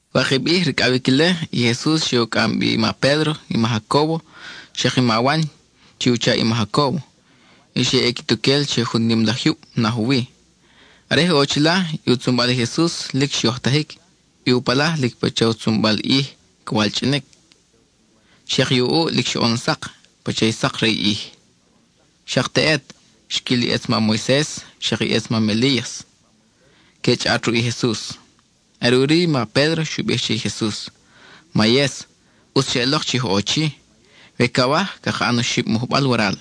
Wakib ʼij ricʼawic ile, i Jesus xe u cʼam bi i ma Pédro, i ma Jacóbo, xak i ma Wan chi u chaʼ i ma Jacóbo, y xe ʼe quituquel che jun nim laj jyub naj u wi. Are je ʼo chila, i u tzunbal i Jesus lic xyojtajic; i u palaj lic pacha u tzunbal ʼij ca walchʼinic; xak i u ʼuʼ lic xoʼon sak, pacha i sak re i ʼij. Xak teʼet, xquil i ʼetz mam Moises, xak i ʼetz mam Elías, que chʼaʼat ruʼ i Jesus. Are ʼuri i ma Pédro xu bij che i Jesus: —¡Mayes, ʼutz xeʼelok chi oj ʼo chi! We cawaj, caka ʼan oxib mujbal waral,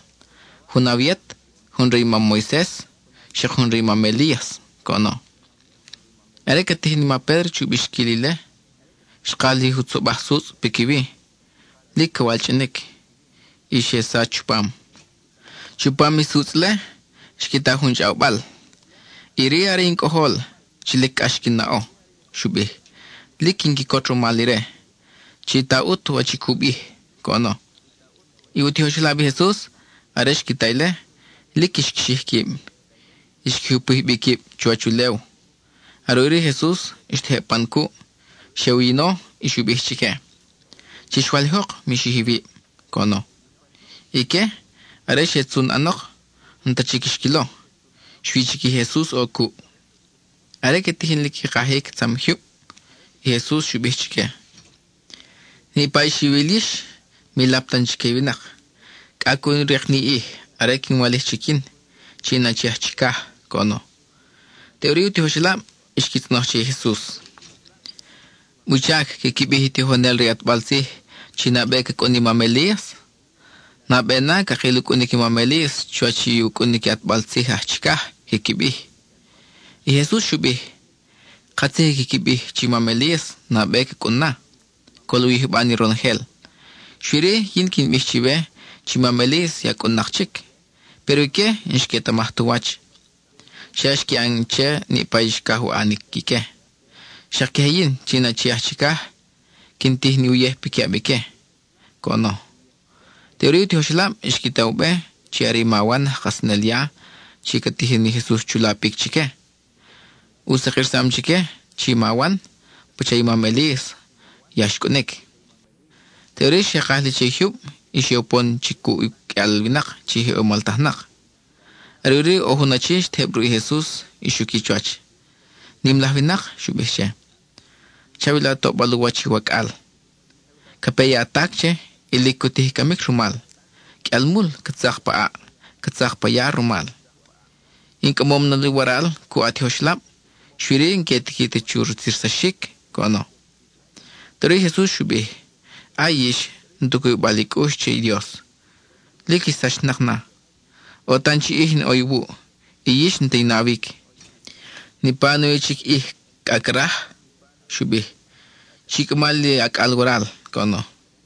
jun awe yet, jun re i mam Moises, xak jun re i mam Elías —coʼono. Are ca tijin i ma Pédro chu bixquil ile, xkaj li jutzobaj sutzʼ piquiwi, lic ca walchʼinic, y xe sach chupam. Chupam i sutzʼ-le xqui ta jun chʼawbal: —Iri are in Cʼojol chi lic cʼax quin naʼo —xu bij—, lic quin quicot rumal ire. Chi ta ʼut wach i cu bij —coʼono. I u tijoxelab i Jesus, are xqui ta ile, lic xqui xij quib; xqui jupij bi quib chuwach ulew. Are ʼuri i Jesus xtejeb pan cuʼ; xe u yino y xu bij chique: —Chix walijok; mi xij iwib —coʼono. Ique, are xe tzun ʼanok, n-ta chic xquilo; xui chic i Jesus ʼo cuʼ. Are que tijin li qui kajic tzam jyub, i Jesus xu bij chique: —Niʼpa i xiwil yix, mi lap tan chique i winak, cʼa cu rik niʼ ij are in walijnak chic yin, chi in Achi aj Chicaj —coʼono. Teʼuri i u tijoxelab xqui tzʼonoj che i Jesus: ¿Wuchac quiqui bij i tijonel re i ʼatbal tzij chi nabe ca cʼun i mam Elías? Nabe na cakil u cʼunic i mam Elías chuwach i u cʼunic i ʼatbal tzij aj chicaj, quiqui bij. I Jesus xu bij: —Katzij i quiqui bij chi mam Elías nabe ca cʼun na, col u yijba ni ronojel. Xui-ri, yin quin bij chiwe chi mam Elías ya cʼun-nak chic, péro ique n-xquetamaj tu wach. Xa xqui ʼan che niʼpa i xcaj u ʼanic ique. Xak queje yin, chi in Achi aj Chicaj, quin tij ni uyej piquiʼab ique —coʼono. Teʼuri i u tijoxelab xqui ta u be chi are i ma Wan aj Kajsanel ya chi ca tijin i Jesus chu lapic chique. U sakirsam chique chi ma Wan pacha i mam Elías ya xcʼunic. Teʼuri xe kaj li che i jyub y xe upon chic cuʼ uqʼuial winak chi je moltajnak. Are ʼuri ʼo jun achi xtejeb ruʼ i Jesus y xuqui chuwach. —Nim laj winak —xu bij che—, chawila toʼbal u wach i wacʼal. Ca pe i atac che, y lic cu tij i camic rumal. Qʼuial mul ca tzak pa ʼaʼ, ca tzak pa ya rumal. In cʼamom na li waral cuʼ a tijoxelab, xui-ri n-que tiqui ta chi rutzirsaxic —coʼono. Teʼuri i Jesus xu bij: —¡Ay, yix, n-tu cubibal i cʼux che i Dios; lic ix sachnak na! ¡ʼO tan chi ʼij in ʼo iwuʼ, y yix n-ta i nawic! ¿Niʼpa nawi chic ʼij cʼa craj? —xu bij—. Chi cʼama li acʼal waral —coʼono.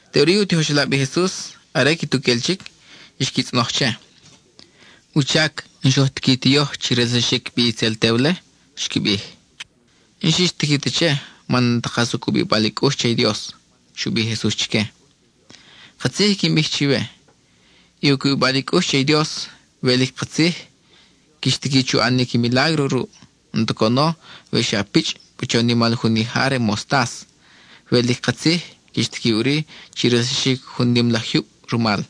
Teʼuri i u tijoxelab i Jesus, are quituquel chic, xqui tzʼonoj che: —¿Wuchac n-xoj tiqui ti yoj chi relsaxic bi itzel tew-le? —xqui bij. —N-xix tiqui ta che man n-ta kas u cubibal i cʼux che i Dios —xu bij i Jesus chique—. Katzij i quin bij chiwe: i cubibal i cʼux che i Dios, we lic katzij, quix tiqui chu ʼanic milágro ruʼ. N-ta coʼono we xa pichʼ pacha u nimal jun ija re mostas, we lic katzij, quix tiqui ʼuri chi relsaxic jun nim laj jyub rumal.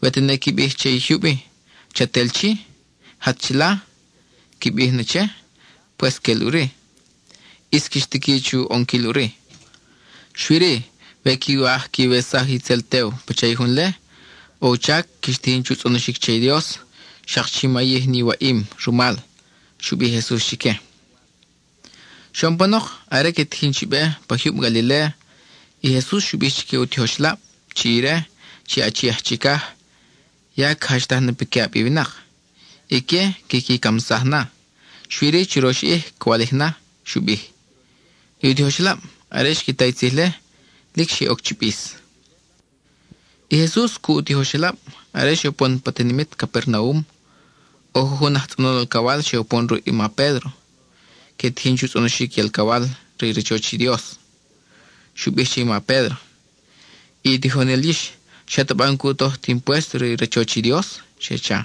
We tene qui bij che i jyub-i: “Chat el chi; jat chila,” qui bij ne che, pues quel ʼuri. ʼIs quix tiqui chu ʼonquil ʼuri. Xui-ri, we quiwaj quiwesaj itzel tew pacha i jun-le, ʼo u chac quix tijin chu tzʼonoxic che i Dios, xak chi mayij ni waʼim rumal —xu bij i Jesus chique. Xoʼon panok, are que tijin chi be pa jyub Galiléa, i Jesus xu bij chique u tijoxelab chi ire, chi Achi aj Chicaj, ya ca jachtaj na piquiʼab i winak. Ique quiqui camsaj na; xui-ri churox ʼij ca walij na, xu bij. I u tijoxelab, are xqui ta i tzij-le, lic xe oc chi bis. I Jesus cuʼ u tijoxelab, are xe upon pa tinimit Capernaum, ʼo jujun aj tzʼonol alcawal xe upon ruʼ i ma Pédro. Que tijin chu tzʼonoxic i alcawal re i rachoch i Dios. Xqui bij che i ma Pédro: —I tijonel yix, ¿xataba n-cu toj ti impuésto re i rachoch i Dios? —xe cha.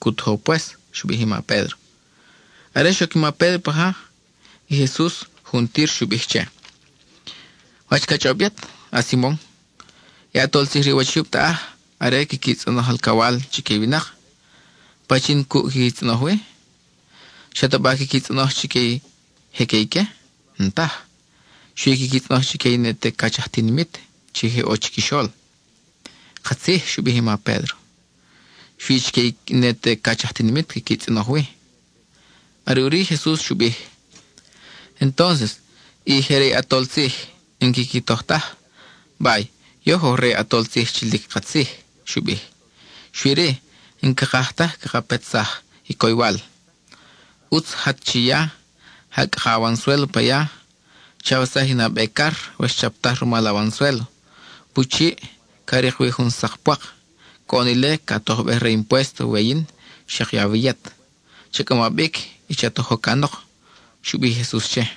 —Cu tojo pues —xu bij i ma Pédro. Are xoc i ma Pédro paja, i Jesus juntir xu bij che: —¿Wach ca chʼob yet, a-Simon? I ʼatol tzij re u wach i jyub taʼaj, are quiqui tzʼonoj alcawal chique i winak, ¿pachin cuʼ quiqui tzʼonoj wi? ¿Xataba quiqui tzʼonoj chique i je que ique? N-taj. Xui quiqui tzʼonoj chique i ne te cach aj tinimit chi je ʼo chiquixol. —Katzij —xu bij i ma Pédro—. Xui chique i ne te cach aj tinimit quiqui tzʼonoj wi. Are ʼuri i Jesus xu bij: —Entons i je re i ʼatol tzij n-quiqui toj taj. Bay, yoj oj re i ʼatol tzij chi lic katzij —xu bij—. Xui-ri, n-cakaj ta caka petsaj i coywal; ʼutz jat chiya, ja cʼaka awansuélo pa ya. Chawesaj i nabe car we xchaptaj rumal awansuélo. Pu chiʼ, ca rik wi jun sak pwak. Coʼon ile ca tojbej re i impuésto we yin, xak i awe yet. Cha cʼama bic y cha tojo canok —xu bij i Jesus che.